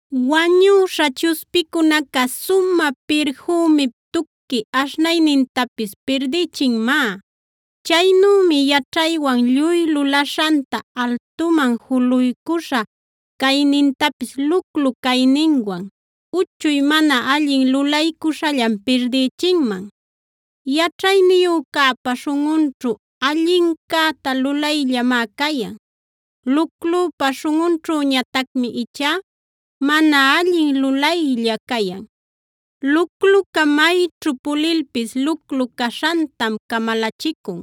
Wañüśha chuspicunaca sumä pirfümip tuqui aśhnaynintapis pirdïchinmá. Chaynümi yaćhaywan lluy lulaśhanta, altuman juluycuśha caynintapis luclu cayninwan uchuy mana alli lulaycuśhallan pirdïchinman. Yaćhayniyücäpa śhunꞌunćhu allincäta lulayllamá cayan; luclüpa śhunꞌunćhüñatacmi ichá mana allin lulaylla cayan. Lucluca mayćhu pulilpis, luclu caśhantam camalachicun;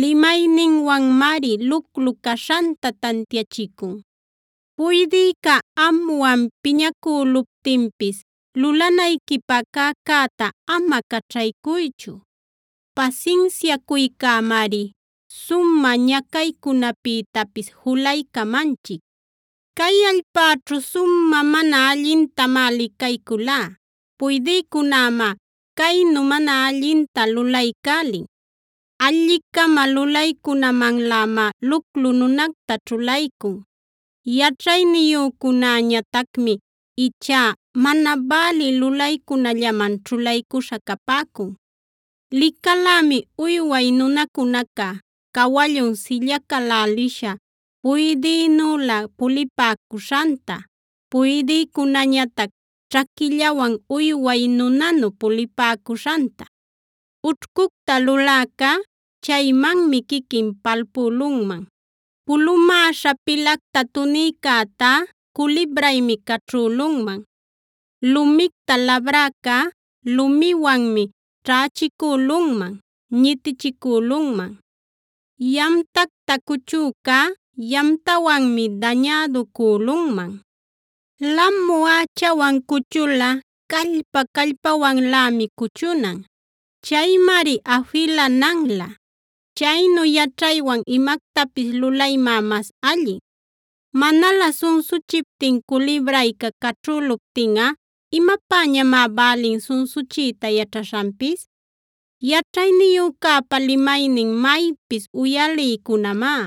limayninwanmari luclu caśhanta tantiachicun. Puydïca amwan piñacüluptinpis lulanayquipä cäcäta ama caćhaycuychu. Pasinsiacuycämari sumä ñacaycunapïtapis julaycamanchic. Cay allpäćhu sumä mana allintamá licayculá; puydïcunämá caynu mana allinta lulaycälin: Alli-cama lulaycunamanlämá luclu nunacta ćhulaycun; yaćhayniyücunäñatacmi ichá mana bälï lulaycunallaman ćhulaycuśha capäcun. Licalämi uyway nunacunaca cawallun sillacalälisha puydïnülä pulipäcuśhanta, puydïcunäñatac ćhaquillawan uyway nunanu pulipäcuśhanta. Ućhcucta luläcá chaymanmi quiquin palpülunman.a Pulumäśha pilacta tunïcätá culibraymi caćhülunman. Lumicta labräcá lumiwanmi ćhächicülunman, ñitichicülunman. Yamtacta cuchücá yamtawanmi däñäducülunman. Lamu ächawan cuchulꞌa callpa-callpawanlämi cuchunan; chaymari afilananlä. Chaynu yaćhaywan imactapis lulaymá mas allin. Manalä sunsuchiptin culibrayca caćhüluptinꞌa ¿imapäñamá bälin sunsuchiyta yaćhaśhanpis? Yaćhayniyücäpa limaynin maypis uyaliycunamá.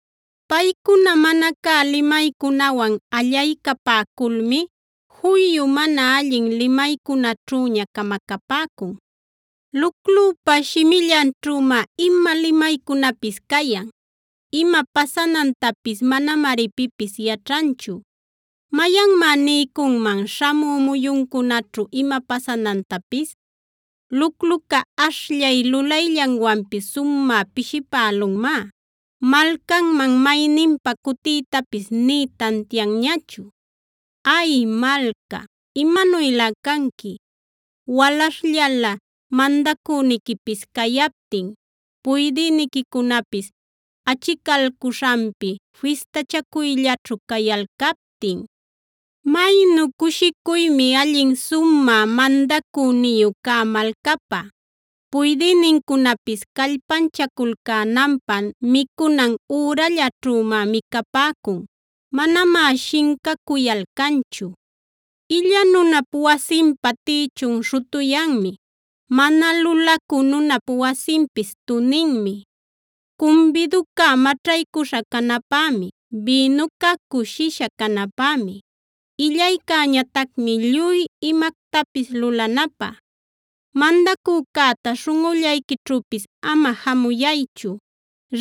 Paycuna mana cä limaycunawan allaycapäculmi juyu mana allin limaycunaćhüña camacapäcun. Luclüpa shimillanćhümá ima limaycunapis cayan. Ima pasanantapis manamari pipis yaćhanchu; ¿mayanmá niycunman śhamü muyuncunäćhu ima pasanantapis? Lucluca ashllay lulayllanwanpis sumä pishipälulmá malcanman mayninpa cutiytapis nï tantianñachu. ¡Ay malca, imanuylä canqui, walaśhllala mandacüniquipis cayaptin, puydïniquicunapis achicalcuśhanpi fistachacuyllaćhu cayalcaptin! Maynu cushicuymi allin sumä mandacüniyu cä malcapä; puydïnincunapis callpanchaculcänanpä micunan ürallaćhümá micapäcun; manamá shincacuyalcanchu. Illa nunap wasinpa tïchun śhutuyanmi; mana lulacü nunap wasinpis tuninmi. Cumbiduca maćhaycuśha canäpämi; bïnuca cushisha canapämi; illaycäñatacmi lluy imactapis lulanapä. Mandacücäta śhunꞌullayquićhüpis ama jamuyaychu;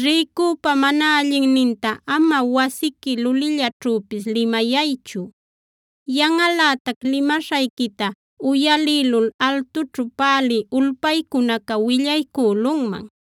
rïcüpa mana allinninta ama wasiqui lulillaćhüpis limayaychu; yanꞌalätac limaśhayquita uyalïlul altućhu pälï ulpaycunaca willaycülunman.